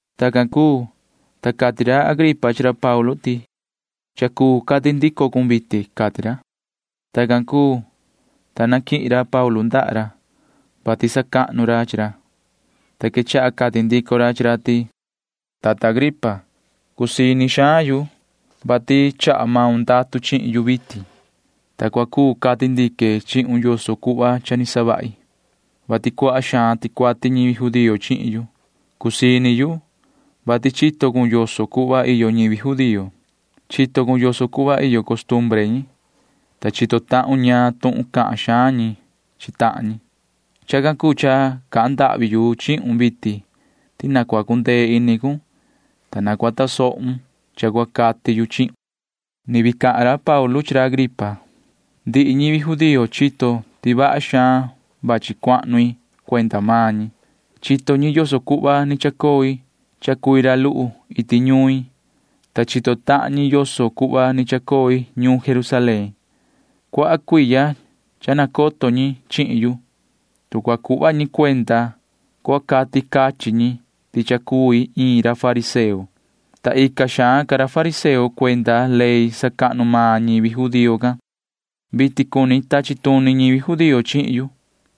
Tacan cuu, ta cati ra Agripa chi ra Paulu ti: ―Cha cuu cati ndico cun vitin ―cati ra. Tacan cuu, ta naquihin ra Paulu ndaha ra, [vati sacahnu ra chi ra,] ta quechaha cati ndico ra chi ra ti: ―Yoho tata Agripa, cusii ini xaan yu, vati chaha maun ndatu chihin yu vitin, ta cua cuu cati ndique chihun yoso cuhva cha ni savahi, vati cuaha xaan ticuati ñivi judío chihin yu. Cusii ini yu, vati chito cun yoso cuhva iyo ñivi judío. Chito cun yoso cuhva iyo costumbre ñi, ta chito tahun ñaan tuhun cahan xaan ñi chi tahan ñi. Chacan cuu cha cahan ndahvi yu chihun vitin ti na cua cundee ini cun, ta cua tasohun cha cua cati yu chihun. [Ni vii cahan ra Paulu chi ra Agripa:] ’Ndihi ñivi judío chito ti vaha xaan cha vachi cuahnu i cuenda maan ñi. Chito ñi yoso cuhva ni chacoi cha cui ra luhu iti ñuin, ta chito tahan ñi yoso cuhva ni chacoi ñuun Jerusalén. Cuaha cuiya cha nacoto ñi chihin yu. Tu cua cuhva ñi cuenda, cua cati cachin ñi ti cha cui iin ra fariseo, ta ica xaan ca ra fariseo cuenda ley sacahnu maan ñivi judío can. Vitin cuni tachi tuni ñivi judío chihin yu,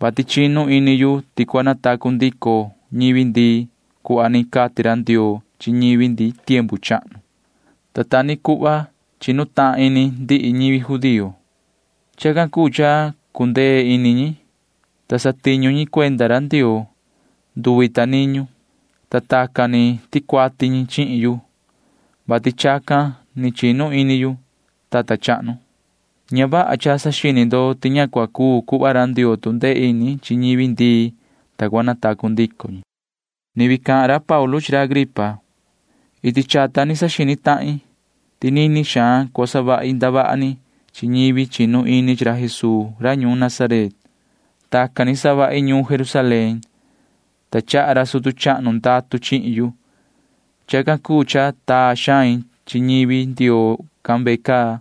vati chinu ini yu ti cua natacu ndico ñivi ndii cuhva ni cati ra Ndioo chi ñivi ndi tiempu chahnu, ta ta ni cuhva chinu tahan ini ndihi ñivi judío. Chacan cuu cha cundee ini ñi, ta satiñu ñi cuenda ra Ndioo nduvi ta niñu, ta tacan ni ticuati ñi chihin yu, vati chacan ni chinu ini yu, yoho tata chahnu. Ña vaha cha saxini ndo ti ña cua cuu cuhva ra Ndioo tu ndee ini chi ñivi ndii, ta cua natacu ndico ñi. [Ni vii cahan ra Paulu chi ra Agripa:] ’Iti chata ni saxini tahin ti nini xaan cua savahi ndavaha ni chi ñivi chinu ini chi ra Jesuu ra ñuun Nazaret. Tacan ni savahi ñuun Jerusalén, ta chaha ra sutu chahnu ndatu chihin yu. Chacan cuu cha taa xain chi ñivi Ndioo can ve caa,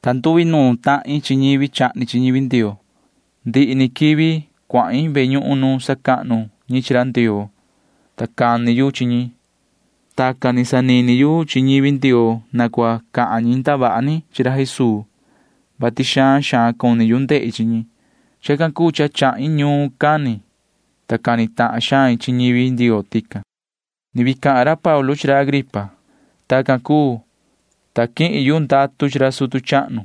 ta nduinuun tahin chi ñivi chahni chi ñivi Ndioo. Ndihi ni quivi cuahin ve ñuhun nu sacahnu ñi chi ra Ndioo, ta cani yu chi ñi. Tacan ni sanini yu chi ñivi Ndioo na cua cahan ñi ndavaha ni chi ra Jesuu, vati xaan xaan cuni yu ndehi chi ñi. Chacan cuu cha chahin ñuun cani, ta cani tahan xain chi ñivi Ndioo tican. [Ni vii cahan ra Paulu chi ra Agripa:] ’Tacan cuu, ta quihin yu ndatu chi ra sutu chahnu,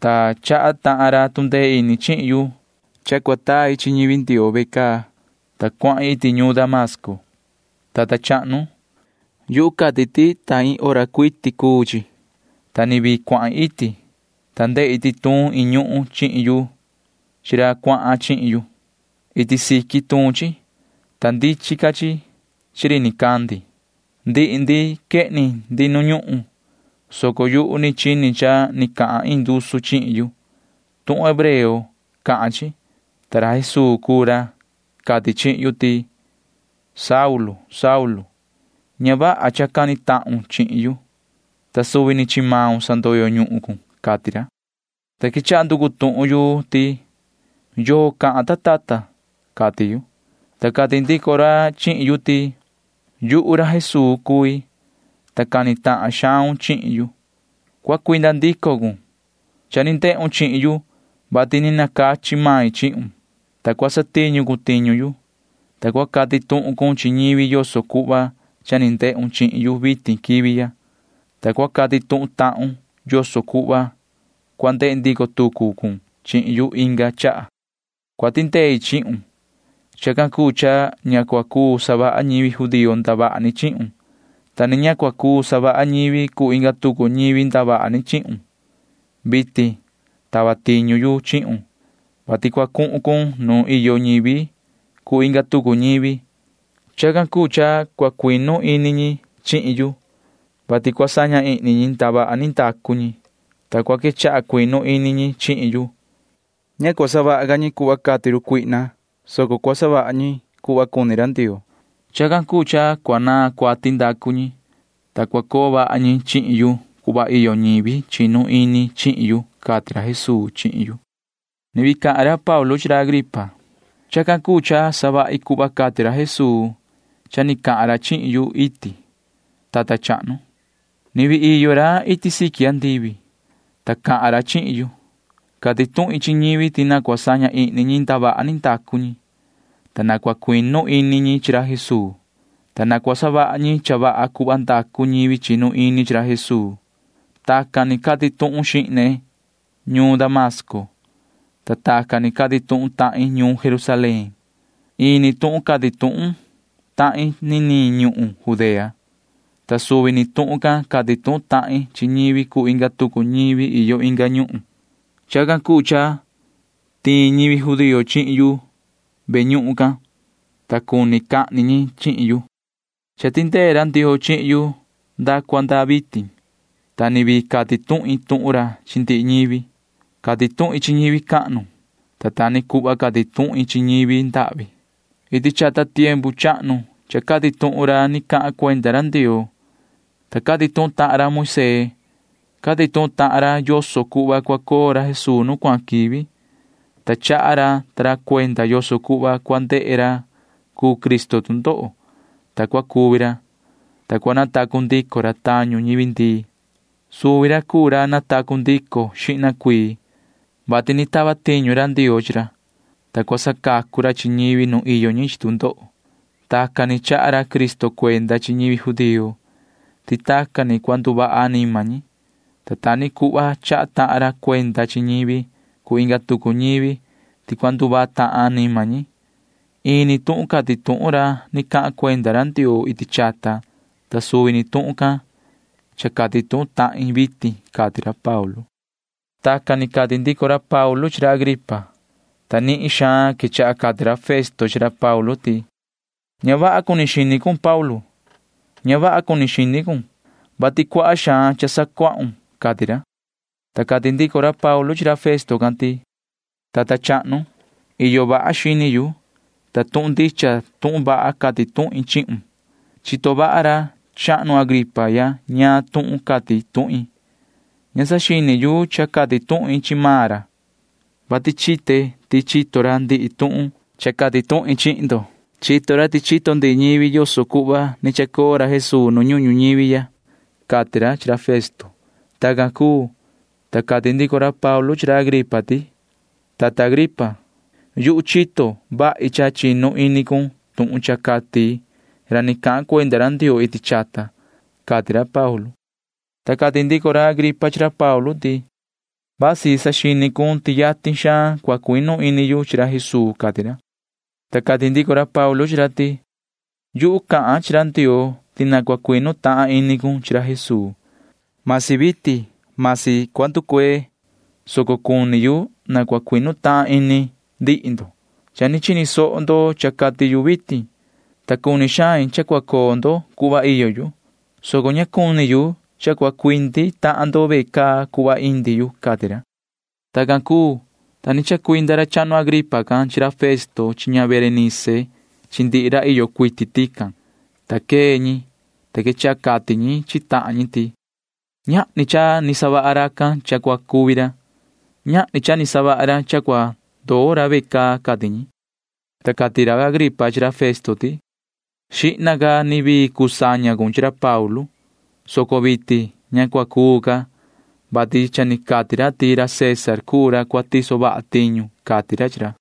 ta chaha tahan ra tu ndee ini chihin yu cha cua tai chi ñivi Ndioo ve caa, ta cuahin iti ñuun Damasco. Yoho tata chahnu, yu cati ti ta maan hora cuu chi, ta ni vii cuahin iti, ta ndehi ti tuun iin ñuhun chihin yu chi ra cuahan chihin yu. Iti siqui tuun chi, ta ndichin ca chi chi ri nicandi. Ndihi ndi quehni ndi nu ñuhun, soco yuhu ni chini cha ni cahan iin ndusu chihin yu. Tuhun hebreo cahan chi, ta ra Jesuu cuu ra cati chihin yu ti: “Yoho Saulu, ña vaha cha cani tahun chihin yu, ta suvi ni chi maun sandoyo ñuhun cun,” cati ra, ta quechaha nducu tuhun yu ti: “¿Yoo cahan, ta tata?” cati yu, ta cati ndico ra chihin yu ti: “Yuhu ra Jesuu cui, ta cani tahan xaun chihin yu. Cua cuinda ndico cun. Cha ni ndehun chihin yu, vati ni nacachi main chihun, ta cua satiñu cun tiñu yu, ta cua cati tuhun cun chi ñivi yoso cuhva cha ni ndehun chihin yu vitin quivi ya, ta cua cati tuhun tahun yoso cuhva cua ndehe ndico tucu cun chihin yu inga chaha. Cua tindei chihun. Chacan cuu cha ña cua cuu savaha ñivi judío ndavaha ni chihun, ta ni ña cua cuu savaha ñivi cuu inga tucu ñivi ndavaha ni chihun. Vitin tava tiñu yu chihun, vati cua cuhun cun nuun iyo ñivi cuu inga tucu ñivi. Chacan cuu cha cua cuinu ini ñi chihin yu, vati cua saña ihni ñi ndavaha ni ndacu ñi, ta cua quechaha cuinu ini ñi chihin yu. Ña cua savaha ca ñi cuhva cati run cuihna, soco cua savaha ñi cuhva cuni ra Ndioo. Chacan cuu cha cua naan cuati ndacu ñi, ta cua coo vaha ñi chihin yu cuhva iyo ñivi chinu ini chihin yu,” cati ra Jesuu chihin yu. [Ni vii cahan ra Paulu chi ra Agripa:] ’Chacan cuu cha savahi cuhva cati ra Jesuu cha ni cahan ra chihin yu iti, tata chahnu. Ni vii iyo ra iti siqui andivi, ta cahan ra chihin yu. Cati tuhin chi ñivi ti na cua saña ihni ñi ndavaha ni ndacu ñi, ta na cua cuinu ini ñi chi ra Jesuu, ta na cua savaha ñi cha vaha cuhva ndacu ñivi chinu ini chi ra Jesuu. Tacan ni cati tuhun xihne ñuun Damasco, ta tacan ni cati tuhun tahin ñuun Jerusalén. Ini tuhun cati tuhun tahin niniin ñuhun Judea, ta suvi ni tuhun can cati tuhun tahin chi ñivi cuu inga tucu ñivi iyo inga ñuhun. Chacan cuu cha tiin ñivi judío chihin yu ve ñuhun cahnu can, ta cuni cahni ñi chihin yu. Cha tindee ra Ndioo chihin yu nda cua nda vitin, ta ni vii cati tuhin tuhun ra chi ndihi ñivi. Cati tuhin chi ñivi cahnu, ta ta ni cuhva cati tuhin chi ñivi ndahvi. Iti chata tiempu chahnu cha cati tuhun ra ni cahan cuenda ra Ndioo, ta cati tuhun tahan ra Moisee. Cati tuhun ra ta ra yoso cuhva cua coo ra Jesuu nu cuahan quivi, ta chaha ra ta ra cuenda yoso cuhva cua ndehe ra cuu Cristo tu ndoho, ta cua cuvi ra, ta cua natacu ndico ra tañu ñivi ndii. Suvi ra cuu ra natacu ndico xihna cuii, vati ni tava tiñu ra Ndioo chi ra, ta cua sacacu ra chi ñivi nu iyo ñi chi tu ndoho. Tacan ni chaha ra Cristo cuenda chi ñivi judío ti tacan ni cua nduvaha anima ñi, ta ta ni cuhva chaha tahan ra cuenda chi ñivi cuu inga tucu ñivi ti cua nduvaha tahan anima ñi. Ini tuhun cati tuhun ra ni cahan cuenda ra Ndioo iti chata, ta suvi ni tuhun can cha cati tuhun tahin vitin ―cati ra Paulu. Tacan ni cati ndico ra Paulu chi ra Agripa ta ra, ta nihin xaan quechaha cati ra Festo chi ra Paulu ti: ―Ña vaha cuni xini cun, yoho Paulu. Ña vaha cuni xini cun, vati cuaha xaan cha sacuahun ―cati ra. Ta cati ndico ra Paulu chi ra Festo can ti: ―Tata chahnu, iyo vaha xini yu, ta tuhun ndicha tuhun vaha cati tuhin chihun. Chito vaha ra chahnu Agripa ya ñaan tuhun cati tuhin. Ña saxini yu cha cati tuhin chi maan ra, vati chite ti chito ra ndihi tuhun cha cati tuhin chihin ndo. Chito ra ti chito ndihi ñivi yoso cuhva ni chacoo ra Jesuu nu ñuhun ñuñivi ya ―cati ra chi ra Festo. Tacan cuu, ta cati ndico ra Paulu chi ra Agripa ti: ―Yoho tata Agripa, yuhu chito vahi cha chinu ini cun tuhun cha cati ra ni cahan cuenda ra Ndioo iti chata ―cati ra Paulu. Ta cati ndico ra Agripa chi ra Paulu ti: ―Vasi saxini cun ti yatin xaan cua cuinu ini yu chi ra Jesuu ―cati ra. Ta cati ndico ra Paulu chi ra ti: ―Yuhu cahan chi ra Ndioo ti na cua cuinu tahan ini cun chi ra Jesuu. Vasi vitin, vasi cua nducuee, soco cuni yu na cua cuinu tahan ini ndihi ndo. Cha ni chini soho ndo cha cati yu vitin, ta cuni xain cha cua coo ndo cuhva iyo yu, soco ña cuni yu cha cua cuindi tahan ndo ve caa cuhva indi yu ―cati ra. Tacan cuu, ta ni chacuinda ra chahnu Agripa can chi ra Festo chi ña Berenice chi ndihi ra iyo cuiti tican, ta quee ñi, ta quechaha cati ñi chi tahan ñi ti: ―Ñahni cha ni savaha racan cha cua cuvi ra. Ñahni cha ni savaha ra cha cua ndoo ra ve caa ―cati ñi. Ta cati ra Agripa chi ra Festo ti: ―Xihna ca ni vii cuu saña cun chi ra Paulu, soco vitin ña cua cuu ca, vati cha ni cati ra ti ra César cuu ra cua tiso vaha tiñu ―cati ra chi ra.